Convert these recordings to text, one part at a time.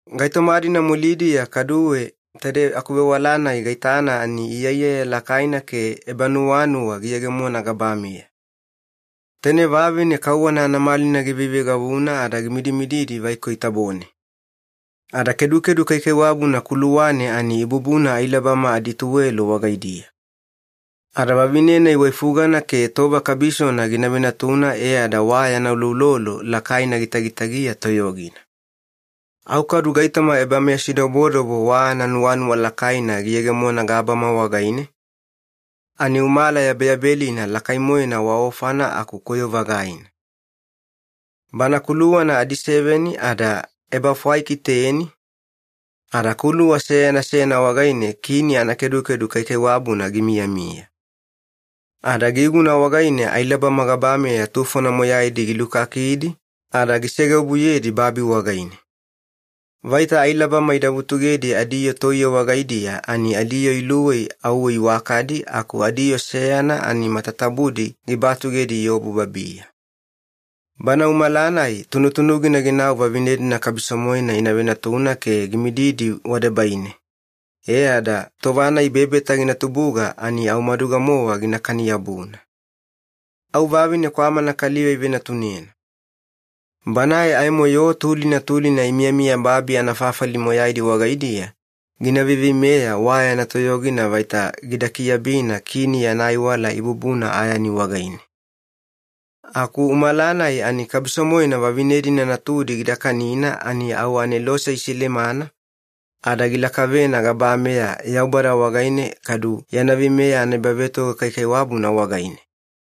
Gaitoma-dina mulidiya kaduwe taide akuvewala-nai gaitana ani iyaiyaya lakaina ke ebanuwanuwa giyegemona gabameya. Taine vavine kauwana anamalina giveiveigavuna ada gimidimididi vaikoi tabone. Ada kedukedu kaikaiwabuna kuluwane ani ibubuna ailabama adituwelo wagaidiya. Ada vavine-nai waifugana ke tova kabisona gina venatuna, e ada wa yana uloulolo lakaina gitagitagiya toyogina. Au kadu gaitoma ebameyasidobodobo wa ananuwanuwa lakaina giyegemona gabama wagaine, ani umala yabeyabelina lakai-moena wa ofana aku koyo-vagaina. Bana kuluwana adiseveni ada ebafwaiki teni, ada kuluwa seyana seyana wagaine kini anakedukedu kaikaiwabuna gimiyamiya. Ada giguna wagaine ailabama gabameya tufona moyaidi gilukakidi ada gisegeobuyedi babi wagaine. Vaita ailabama ida vutugedi adiyoo toiye wagaidiya ani adiyoo iluwei auwe iwakadi aku adiyoo seyana ani matatabudi gibatugedi iobu babiya. Bana umala-nai tunutunugina ginau vavine-dina kabiso-moena ina venatuna ke gimididi wadebaine, e ada tova-nai bebeta gina tubuga ani au maduga-mowa ginakani-yabuna. Au vavine kwamana kaliva ivenatunena. Banae aimo yoo tulina tulina imiyamiya babi anafafali moyaidi wagaidiya gina veiveimeya wa yana toyogina vaita gida kiabina kini yana aiwala ibubuna ayani wagaine. Aku umala-nai ani kabiso-moena vavine-dina natudi gida kanina ani au anelose isilemana ada gilakavena gabameya Yaubada wagaine, kadu yana veimeya anaebavetoga kaikaiwabuna wagaine.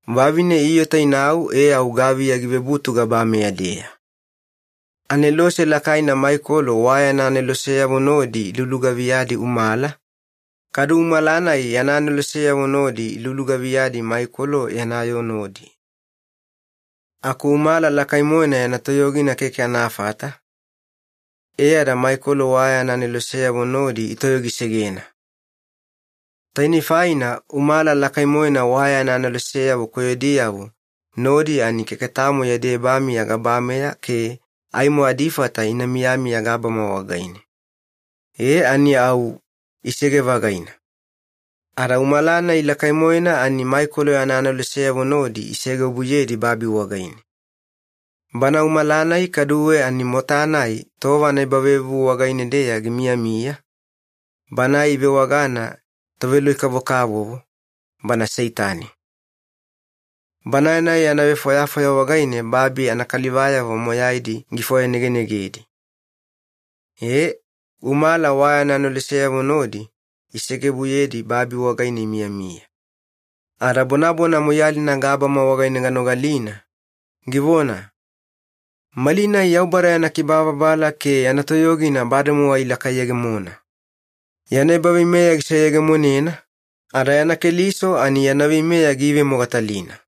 Vavine iota inau, e au gaviya givebutu gabameya-deya. Anelose lakaina Maikolo wa yana aneloseyavo nodi ilulugaviyadi umala, kadu umala-nai yana aneloseyavo nodi ilugaviyadi Maikolo yana yoo nodi. Aku umala lakai-moena yana toyogina keke anafata, e ada Maikolo wa yana aneloseyavo nodi itoyogisegena. Tainei faina umala lakai-moena wa yana aneloseyavo koyodiyavo nodi ani keke tamo yadi ebamiya gabameya ke aimo adifata ina miyamiya gabama wagaine. E ani au, isege-vagaina. Ada umala-nai lakai-moena ani Maikolo yana aneloseyavo nodi isegeobuyedi babi wagaine. Bana umala-nai kaduwe ani mota-nai tova anaebavevuvu wagaine-deya gimiyamiya, banae ivewagana ‘toveloi-kavokavovo’, bana Seitani. Banae-nai yana vefwayafwaya wagaine babi anakalivayavo moyaidi gifwayanegenegedi. Ee, umala wa yana aneloseyavo nodi isegeobuyedi babi wagaine imiyamiya. Ada bonabona moiyalina gabama wagaine ganogalina, givona, “Malinai Yaubada yana kibababala ke yana toyogina bademowa ilakayegemona! Yana ebaveimeya giseyegemonena, ada yana Keliso ani yana veimeya giivemogatalina.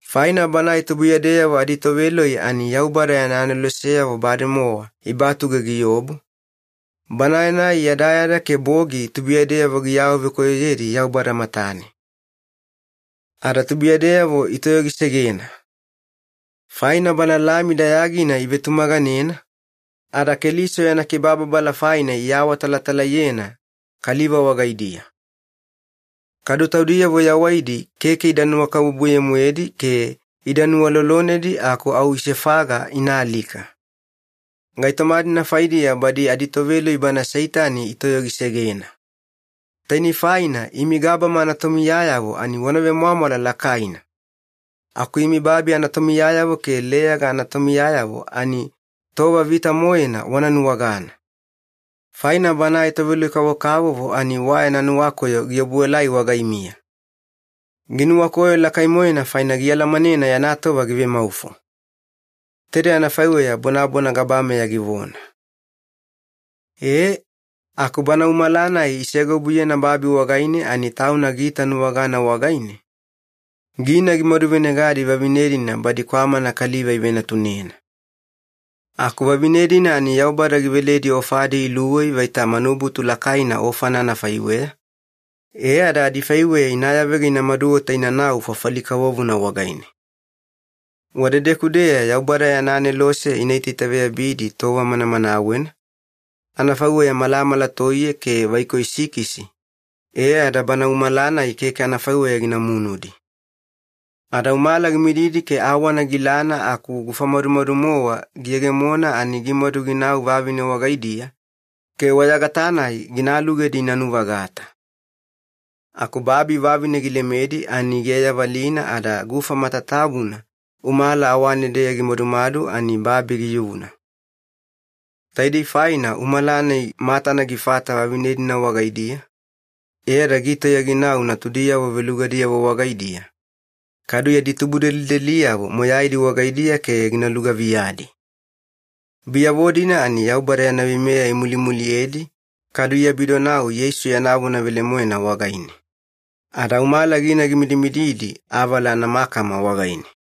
Faina banae tubuiyadeyavo aditoveloi ani Yaubada yana aneloseyavo bademowa ibatuge giobu, banae-nai yadayada ke bogi tubuiyadeyavo giawavekoyoyedi Yaubada matane. Ada tubuiyadeyavo itoyogisegena. Faina Bana Lami dayagina ivetumaganena, ada Keliso yana kibababala faina iawatalatalaiyena kaliva wagaidiya. Kadu taudiyavo yawaidi keke ida nuwakabubuye-moedi ke ida nuwalolonedi aku au isefaga ina alika. Gaitoma-dina faidiya badi aditoveloi bana Seitani itoyogisegena. Tainei faina imi gabama anatomiyayavo ani wana vemwamwala lakaina! Aku imi babi anatomiyayavo ke leyaga anatomiyayavo ani tova vita-moena wana nuwagana! Faina banae toveloi-kavokavovo ani wa yana nuwakoyo giobuelai wagaimiya. Ginuwakoyo lakai-moena faina gialamanena yana tova givemaufo.” Taide anafaiweya bonabona gabameya givona. Ee, aku bana umala-nai isegeobuyena babi wagaine ani tauna giitanuwagana wagaine, gina gimaduvenegadi vavine-dina badi kwamana kaliva ivenatunena. Aku vavine-dina ani Yaubada giveledi ofadi iluwei vaita manubutu lakaina ofana anafaiweya, e ada adifaiweya ina yavega ina maduota inanau fafali kavovona wagaine. Wadedeku-deya Yaubada yana anelose ina itaitaveyabidi tova manamanawena, anafaiweya malamala toiye ke vaikoi sikisi, e ada bana umala-nai keke anafaiweya gina munudi. Ada umala gimididi ke awana gilana aku gufa madumadu-mowa giyegemona ani gimadu ginau vavine wagaidiya ke wayagata-nai gina alugedi ina nu-vagata. Aku babi vavine gilemedi ani giayavalina ada gufa matatabuna umala awane-deya gimadumadu ani babi giyuna. Taidei faina umala-nai matana gifata vavine-dina wagaidiya, e ada gitauya ginau natudiyavo velugadiyavo wagaidiya kadu yadi tubudelideliyavo moyaidi wagaidiya ke gina lugaviyadi. Biyavo-dina ani Yaubada yana veimeya imulimuliyedi, kadu iabidonau Yeisu yana vona velemoena wagaine. Ada umala gina gimidimididi avala anamakama wagaine.